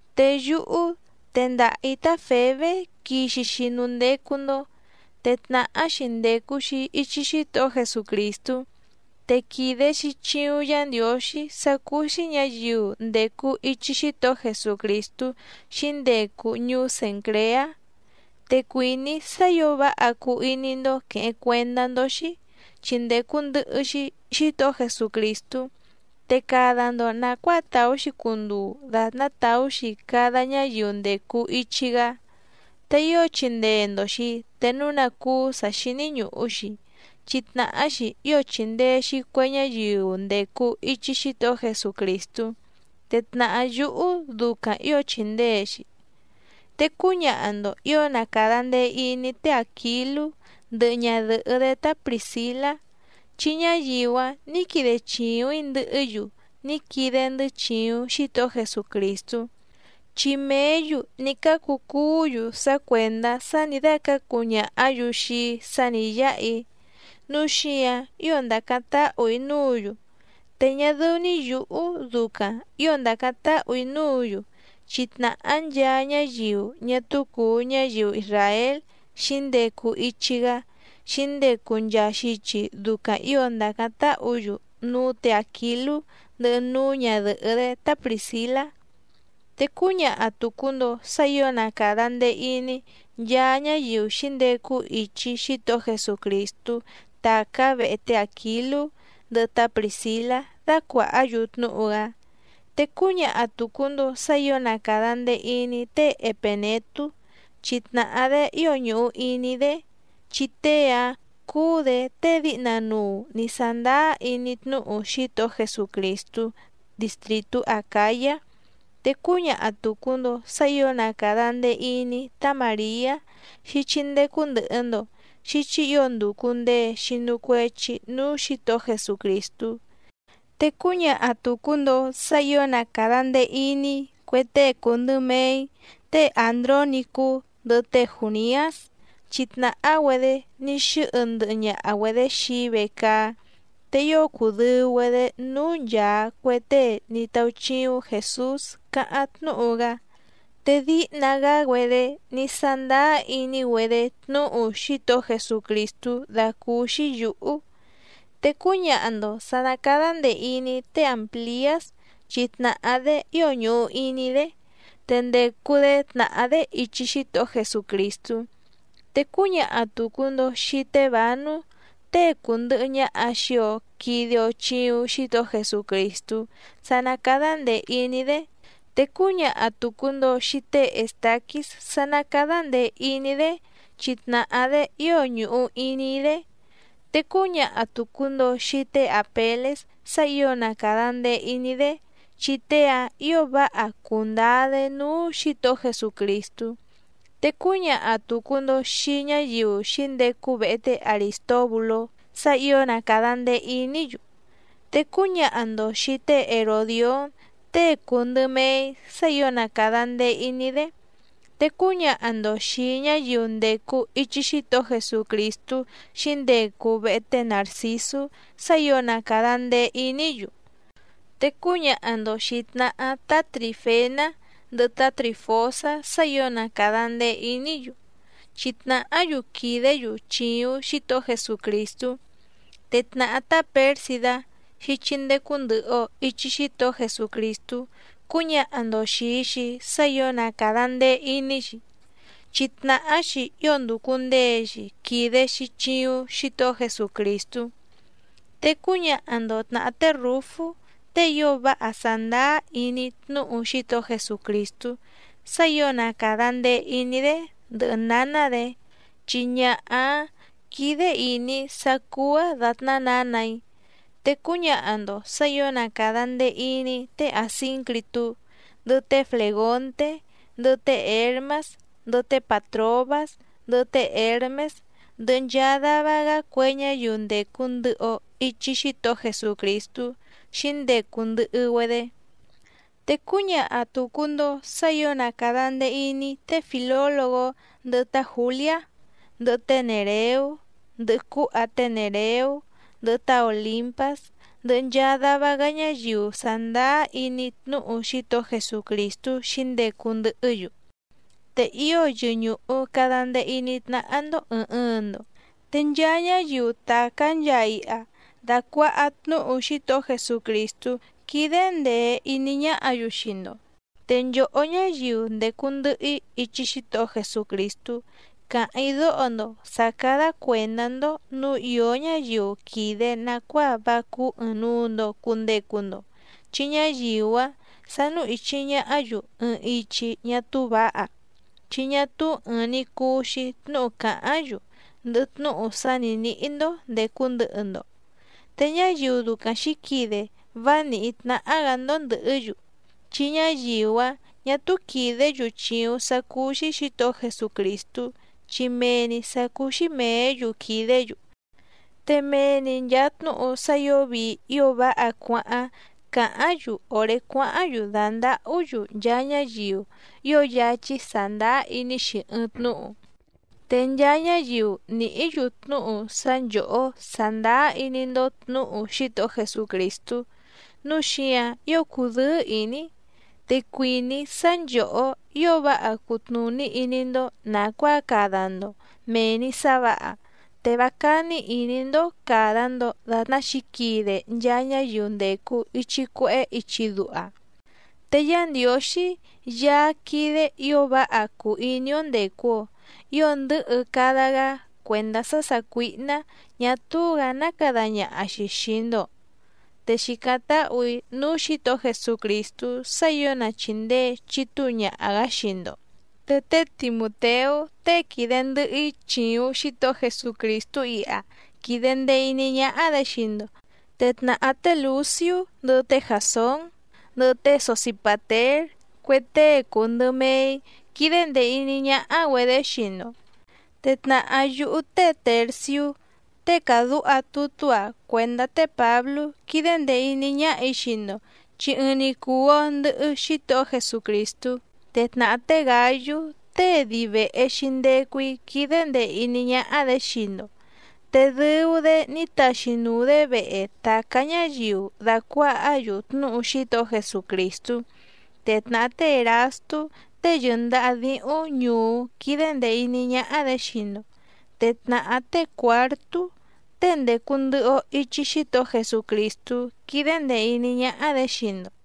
Te yúhú tendaha‑ǐ tá Fèbé quixi‑xi núú ndécú‑ndó, te tnàhá‑xi ndècu‑xi ichi Xítohó Jesucrìstú, te quìde‑xi chiuⁿ Yá Ndiǒxí sá cúú‑xí ñǎyiu ndècu ichi Xítohó Jesucrìstú xǐndecu ñuú Cèncreá. Te cuìní‑í sá ǐo váha cuu iní‑ndó quèheⁿ cuendá‑ndó‑xí, chi ndècu ndɨhɨ‑xi Xítohó Jesucrìstú, te cada‑ndo nàcuáa tàú‑xi cunduu dàtná tàú‑xi cada ñáyiu ndècu ichi‑gá, te ío chindee‑ndo‑xi te núu ná cúú sǎ xíní ñùhu‑xi, chi tnàhá‑xi ío chìndee‑xi cue ñáyiu ndècu ichi Xítohó Jesucrìstú, te tnàhá yúhú ducaⁿ ǐo chìndee‑xi. Te cúñaha‑ndo ǐo na càda ndee iní té Àquilú ndɨhɨ ñadɨ̀hɨ́‑dé tá Prìscilá, chi ñáyiu‑áⁿ nǐ quide chìuⁿ‑í ndɨhɨ́‑yu ní quide‑ndɨ́ chìuⁿ Xítohó Jesucrìstú. Chi mèé‑yu ní cácu cuú‑yu sá cuèndá sá nǐ dácǎcu ñàhá‑yu xii‑í sá nǐ yáha‑í, núu xíǎⁿ ío ndàcáⁿ táhù‑í núǔ‑yu, te ñá dɨ́ú‑ní yǔhú ducaⁿ ǐo ndàcáⁿ táhù‑í núǔ‑yu chi tnàhá nchaa ñáyiu ñá túú cùu ñáyiu isràél xǐndecu ichi‑gá xǐndecu nchaa xichi ducaⁿ ǐo ndàcáⁿ táhǔ‑yu núú tě Àquilú ndɨhɨ núú ñadɨ̀hɨ́‑dé tá Prìscilá. Te cúñaha tùcu‑ndo sá ǐo na càda ndee iní nchaa ñáyiu xǐndecu ichi Xítohó Jesucrìstú tàcá vehe té Àquilú ndɨhɨ tá Prìscilá dácuàhá‑yu tnúhu‑gá, te cúñaha tùcu‑ndo sá ǐo na càda ndee iní té Epènetú chi tnàhá‑dé ío ñùhu iní‑í‑dé, chi tée‑áⁿ cúú‑dě tée díhna nuu nǐ sándáá iní tnúhu Xítohó Jesucrìstú distrìtú Acǎyá. Te cúñaha tùcu‑ndo sá ǐo na càda ndee iní tá Màriá xíchí ndécú ndɨ̀hɨ‑ndo, xíchí ǐo ndùcu ndee xinu cuechi núú Xǐtohó Jesucrìstú. Te cúñaha tùcu‑ndo sá ǐo na càda ndee iní cue tée cùu ndɨ mee‑í té Àndrónicú ndɨhɨ té Jùniás, chi tnàhá‑güedé ní xɨ́hɨ ndɨhɨ ñaha‑güedě xii‑í vecaá, te ío cùdɨu‑güedé núú nchàa cue tée ní táúchíúⁿ Jèsús cáháⁿ tnúhu‑gá. Te díhna‑gá‑güedé ní sándáá iní‑güedé tnúhu Xítohó Jesucrìstú dàcúúxí yǔhú. Te cúñaha‑ndo sǎ ná càda ndee iní té Àmpliás chi tnàhá‑dé ío ñùhu iní‑í‑dé, te ndècu‑dé tnàhá‑dé ichi Xítohó Jesucrìstú. Te cúñaha tùcu‑ndo xii té Bǎnú tée cùndɨhɨ ñaha xii‑o quide‑o chiuⁿ Xítohó Jesucrìstú sá ná càda ndee iní‑dé, te cúñaha tùcu‑ndo xii té Èstaquís sá ná càda ndee iní‑dé chi tnàhá‑dé ío ñùhu iní‑í‑dé. Te cúñaha tùcu‑ndo xii té Àpelés sá ǐo na càda ndee iní‑dé, chi tée‑áⁿ ǐo váha cùndáá‑dé núú Xǐtohó Jesucrìstú, te cúñaha tùcu‑ndo xii ñáyiu xǐndecu vehe té Arìstóbulú sá ǐo na càda ndee iní‑yu. Te cúñaha‑ndo xìi té Heròdión tée cùu ndɨ mee‑í sá ǐo na càda ndee iní‑dé, te cúñaha‑ndo xìi ñáyiu ndècu ichi Xítohó Jesucrìstú xǐndecu vehe té Nàrcisú sá ǐo na càda ndee iní‑yu. Te cúñaha‑ndo xìi tnahá tá Trìfená ndɨhɨ tá Trìfosá sá ǐo na càda ndee iní‑yu, chi tnàhá‑yu quìdé‑yu chìuⁿ Xítohó Jesucrìstú. Te tnàhá tá Pěrsidá xíchí ndécú ndɨ̀hɨ‑o ichi Xítohó Jesucrìstú cúñaha‑ndo xìi‑xi sá ǐo na càda ndee iní‑xi, chi tnàhá‑xi ío ndùcu ndee‑xi quide‑xi chiuⁿ Xítohó Jesucrìstú. Te cúñaha‑ndo tnàhá té Rǔfú tée ío váha sàndáá iní tnúhu Xítohó Jesucrìstú sá ǐo na càda ndee iní‑dé ndɨhɨ nǎná‑dě, chi ñaha‑áⁿ quídé ìní‑í sá cúú‑áⁿ dàtná nǎnà‑í. Te cúñaha‑ndo sǎ ǐo na càda ndee iní té Àsíncritú, ndɨhɨ té Flègonté, ndɨhɨ té Hěrmás, ndɨhɨ té Pàtrobás, ndɨhɨ té Hěrmés, ndɨhɨ nchaa dava‑gá cue ñáyiu ndècu ndɨhɨ‑o ichi Xítohó Jesucrìstú xǐndecu ndɨhɨ‑güedé. Te cúñaha tùcu‑ndo sá ǐo na càda ndee iní té Fìlólogó, ndɨhɨ tá Jǔliá, ndɨhɨ té Nèreú, ndɨhɨ cúha té Nèreú, ndɨhɨ tá Òlimpás, ndɨhɨ nchaa dava‑gá ñáyiu sàndáá iní tnúhu Xítohó Jesucrìstú xǐndecu ndɨhɨ́‑yu. Te ío yɨñùhu cada ndee iní tnáhá‑ndó ɨ̀ɨⁿ ɨɨⁿ‑ndo. Te nchaa ñáyiu tàcá nchaa iha dàcuaha tnúhu Xítohó Jesucrìstú quídé ndèe iní ñáhǎ‑yu xii‑ndo. Te nchòhó ñáyiu ndècu ndɨhɨ‑í ichi Xítohó Jesucrìstú càháⁿ‑í dóho‑ndo sǎ cádá cuèndá‑ndó nǔu ìó ñáyiu quìde nacuáa vá cúú ɨ̀ɨⁿnuu‑ndo cundecu‑ndo, chi ñáyiu‑áⁿ sánú ìchi ñahá‑yu ɨɨⁿ ichi ñá túú vǎha, chi ñá túú ɨ̀ɨⁿ‑ni cuu‑xi tnúhu càháⁿ‑yu ndɨhɨ tnúhu sá nǐ níhí‑ndó ndècu ndɨhɨ‑ndo, te ñáyiu ducaⁿ xǐquide vá nìhí tnáhá‑gǎ‑ndó ndɨ̀hɨ́‑yu. Chi ñáyiu‑áⁿ ñà túú quìdé‑yu chìuⁿ sá cúú‑xí Xǐtohó Jesucrìstú, chi mee‑ni sǎ cúú‑xí mèé‑yu quìdé‑yu, te mee‑ni nchàa tnúhu sá ǐo vii ío váha cuáháⁿ càháⁿ‑yu òré cuáháⁿ‑yu dàndahú‑yu nchaa ñáyiu ío yáchí sàndáá iní‑xi ɨɨⁿ tnúhu. Te nchaa ñáyiu nìhí‑yu tnúhu sá nchòhó sàndáá iní‑ndó tnǔhu Xítohó Jesucrìstú, núu xíǎⁿ ío cùdɨ́ɨ́ ìní‑í. Te cuìní‑í sá nchòhó ío váha cutnùní iní‑ndó nàcuáa cada‑ndo mèe‑ni sá vǎha, te vá cání ìní‑ndó càda‑ndo datná xǐquide nchaa ñáyiu ndècu ichi cuehé ichi duha. Te Yá Ndiǒxí Yaá quídé ǐo váha cùu iní‑ó ndècu‑o ío ndɨ̌hɨ cada‑gá cuèndá sá sàcuíhná ñà túú‑gǎ ná cada ñaha‑xi xìi‑ndo, te xìcáⁿ táhù‑í núú Xǐtohó Jesucrìstú sá ǐo na chìndee chitúu ñaha‑gǎ xii‑ndo. Te té Timùteú tée quìde ndɨhɨ‑í chìuⁿ Xítohó Jesucrìstú iha quìde ndee iní ñáhá‑dě xii‑ndo, te tnàhá té Lùciú, ndɨhɨ té Jàsón, ndɨhɨ té Sosipàtér cue tée cùu ndɨ mee‑í quídé ndèe iní ñáhá‑güedě xii‑ndo. Te tnàhá yúhú té Tèrciú tée càdúha tutú‑a cuèndá té Pǎblú quídé ndèe iní ñáhà‑í xii‑ndo, chi ɨɨⁿ‑ni cùu‑o ndɨhɨ Xítohó Jesucrìstú. Te tnàhá té Gǎyú tée dii vèhe‑xi ndecu‑í quídé ndèe iní ñáhá‑dě xii‑ndo, te dɨu‑dé ní taxi nùu‑dé vehe tàcá ñáyiu dàcuahá‑yu tnúhu Xítohó Jesucrìstú. Te tnàhá té Èrastú tée yɨ̀ndaha díhúⁿ ñùú quídé ndèe iní ñáhá‑dě xii‑ndo, te tnàhá té Cuǎrtú tée ndècu ndɨhɨ‑o ichi Xítohó Jesucrìstú quídé ndèe iní ñáhá‑dě xii‑ndo.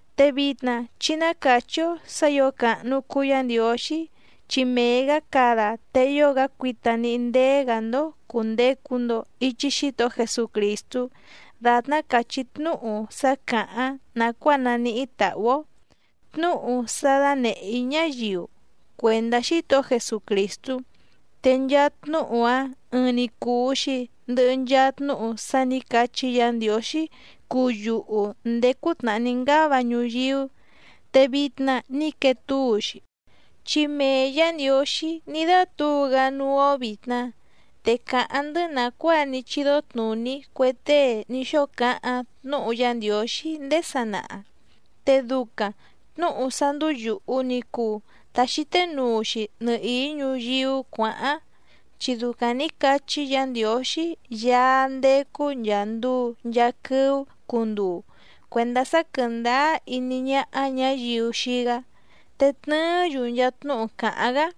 Te vitna chí ná càchí‑ó sǎ ǐo càhnu cuu Yá Ndiǒxí, chi mee‑gǎ cada te ío‑gá cuita níhí ndéé‑gǎ‑ndó cùndecu‑ndo ichi Xítohó Jesucrìstú dàtná càchí tnúhu sá càháⁿ nàcuáa naníhí tàhú‑ó, tnúhu sá dánèhé‑í ñáyiu cuèndá Xítohó Jesucrìstú, te nchaa tnúhu‑a ɨɨⁿ‑ni cùu‑xi ndɨhɨ nchaa tnúhu sá nǐ cachí Yǎ Ndiǒxí cuu yuhu ndèé cútnàhá ní ngáva ñuyíú, te vitna ní quee túu‑xi, chi mee Yǎ Ndiǒxí ní dátǔu‑gá núú‑ó vìtna, te càháⁿ‑ndɨ́ nàcuáa ní chídó tnùní cue tée ní xóo cáháⁿ tnúhu Yá Ndiǒxí ndéé sanaha. Te ducaⁿ tnǔhu sá ndúú yùhu ni cuu ta xíté nuu‑xi nɨhìí ñuyíú cuǎháⁿ, chi ducaⁿ nǐ cachí Yǎ Ndiǒxí Yaá ndécú nchàa nduu nchaa quɨ́ú cunduu cuèndá sá quɨ̀ndáá iní ñáhá ñǎyiu xii‑gá, te tnɨɨ́‑yu nchaa tnúhu càháⁿ‑gá.